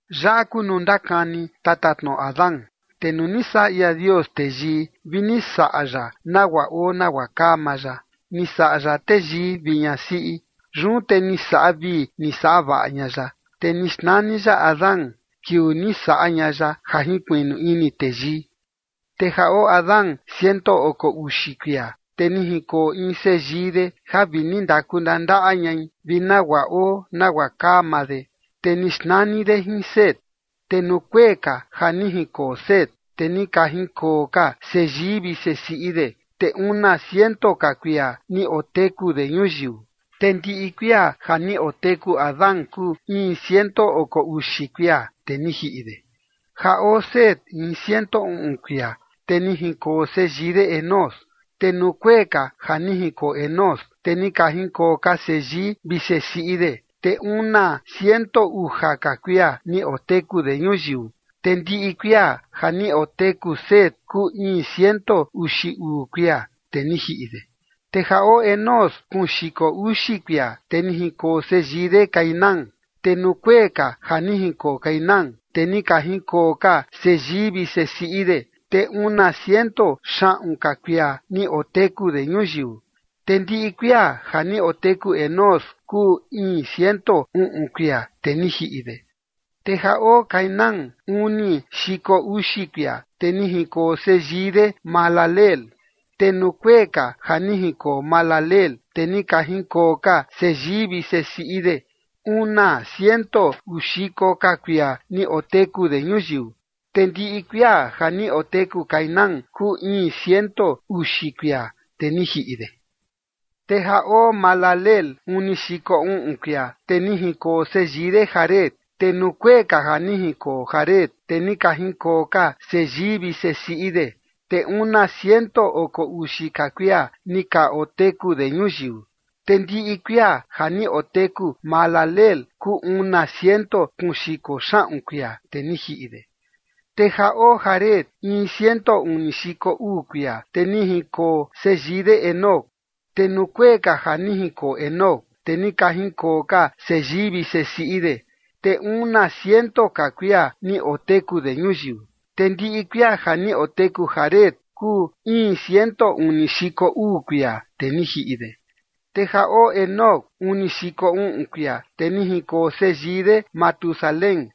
Yaꞌa kuu nuu ndakani tatatnoꞌo Adán. Te nuu ni saꞌa ia Dios teyii vi ni saꞌa ya nagua oo nagua kaa maa ya. Ni saꞌa ya teyii vi ñasiꞌi. Yun te ni saꞌa vii ni saꞌa vaꞌa ña ya, te ni xnani ya Adán kiuu ni saꞌa ña ya ja jinkuiꞌnu ini teyii. Te ja oo Adán ciento oko uxi kuia, te ni jinkoo in seyii de ja vi ni ndaku ndandaꞌa ñai vi nagua oo nagua kaa maa de. Te ni xnani de jin Set. Te nuu kuee ka ja ni jinkoo Set, te ni ka jinkoo ka seyii vi sesiꞌi de, te una ciento ka kuia ni oteku de ñuyiu. Te ndiꞌi kuia ja ni oteku Adán kuu iin ciento oko uxi kuia, te ni jiꞌi de. Ja oo Set in ciento uꞌun kuia, te ni jinkoo seyii de Enós. Te nuu kuee ka ja ni jinkoo Enós, te ni ka jinkoo ka seyii vi sesiꞌi de, te una ciento uja ka kuia ni oteku de ñuyiu. Te ndiꞌi kuia ja ni oteku Set kuu iin ciento uxi uu kuia, te ni jiꞌi de. Te ja oo Enós kuun xiko uxi kuia, te ni jinkoo seyii de Cainán. Te nuu kuee ka ja ni jinkoo Cainán, te ni ka jinkoo ka seyii vi sesiꞌi de, te una ciento xaꞌun ka kuia ni oteku de ñuyiu. Te ndiꞌi kuia ja ni oteku Enós kuu iin ciento uꞌun kuia, te ni jiꞌi de. Te ja oo Cainán uni xiko uxi kuia, te ni jinkoo seyii de Mahalaleel. Te nuu kuee ka ja ni jinkoo Mahalaleel, te ni ka jinkoo ka seyii vi sesiꞌi de una ciento uu xiko ka kuia ni oteku de ñuyiu. Te ndiꞌi kuia ja ni oteku Cainán kuu iin ciento uxi kuia, te ni jiꞌi de. Te ja oo Mahalaleel uni xiko uꞌun kuia, te ni jinkoo seyii de Jared. Te nuu kuee ka ja ni jinkoo Jared, te ni ka jinkoo ka seyii vi sesiꞌi de, te una ciento oko uxi ka kuia ni ka oteku de ñuyiu. Te ndiꞌi kuia ja ni oteku Mahalaleel kuu una ciento kuun xiko xaꞌun kuia, te ni jiꞌi de. Te ja oo Jared in ciento uni xiko uu kuia, te ni jinkoo seyii de Enoc. Te nuu kuee ka ja ni jinkoo Enoc, te ni ka jinkoo ka seyii vi sesiꞌi de, te una ciento ka kuia ni oteku de ñuyiu. Te ndiꞌi kuia ja ni oteku Jared kuu iin ciento uni xiko uu kuia, te ni jiꞌi de. Te ja oo Enoc uni xiko uꞌun kuia, te ni jinkoo seyii de Matusalén.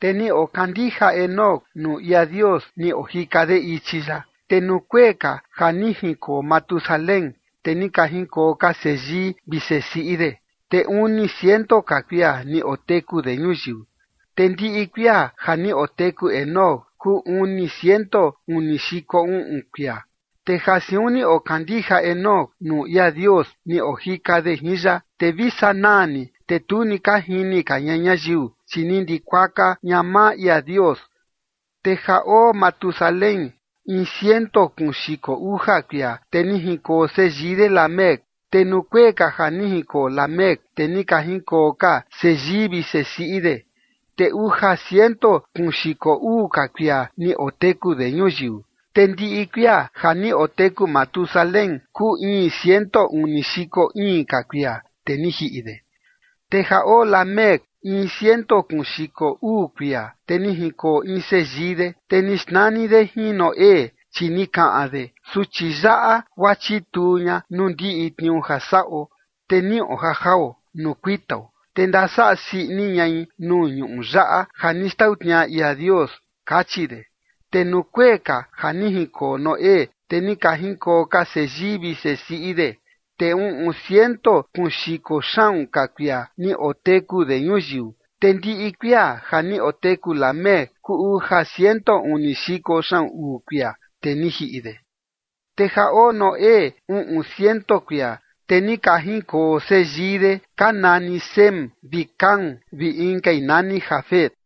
Te ni okandija Enoc nuu ia Dios ni ojika de ichi ya. Te nuu kuee ka ja ni jinkoo Matusalén, te ni ka jinkoo ka seyii vi sesiꞌi de, te uni ciento ka kuia ni oteku de ñuyiu. Te ndiꞌi kuia ja ni oteku Enoc kuu uni ciento uni xiko uꞌun kuia. Te ja siun ni okandija Enoc nuu ia Dios ni ojika de jin ya, te vi sanaa ni, te tu ni ka jini ka ña ñayiu, chi ni ndikuaka ña maa ia Dios. Te ja oo Matusalén in ciento kuun xiko uja kuia, te ni jinkoo seyii de Lamec. Te nuu kuee ka ja ni jinkoo Lamec, te ni ka jinkoo ka seyii vi sesiꞌi de, te uja ciento kuun xiko uu ka kuia ni oteku de ñuyiu. Te ndiꞌi kuia ja ni oteku Matusalén kuu iin ciento uni xiko iin ka kuia, te ni jiꞌi de. Te ja oo Lamec in ciento kuun xiko uu kuia, te ni jinkoo in seyii de. Te ni xnani de jin Noé, chi ni kaꞌan de: “Suchi yaꞌa guaa chituu ña nuu ndiꞌi tniuu ja saꞌo, te niꞌo ja jao nuu kuitao, te ndasaꞌa sii ini ñai nuu ñuꞌu yaꞌa ja ni xtau tniaꞌa ia Dios”, kachi de. Te nuu kuee ka ja ni jinkoo Noé, te ni ka jinkoo ka seyii vi sesiꞌi de, te uꞌun ciento kuun xiko xaꞌun ka kuia ni oteku de ñuyiu. Te ndiꞌi kuia ja ni oteku Lamec kuu uja ciento uni xiko xaꞌun uu kuia, te ni jiꞌi de. Te ja oo Noé uꞌun ciento kuia, te ni ka jinkoo seyii de ka nani Sem vi Cam vi inkai nani Jafet.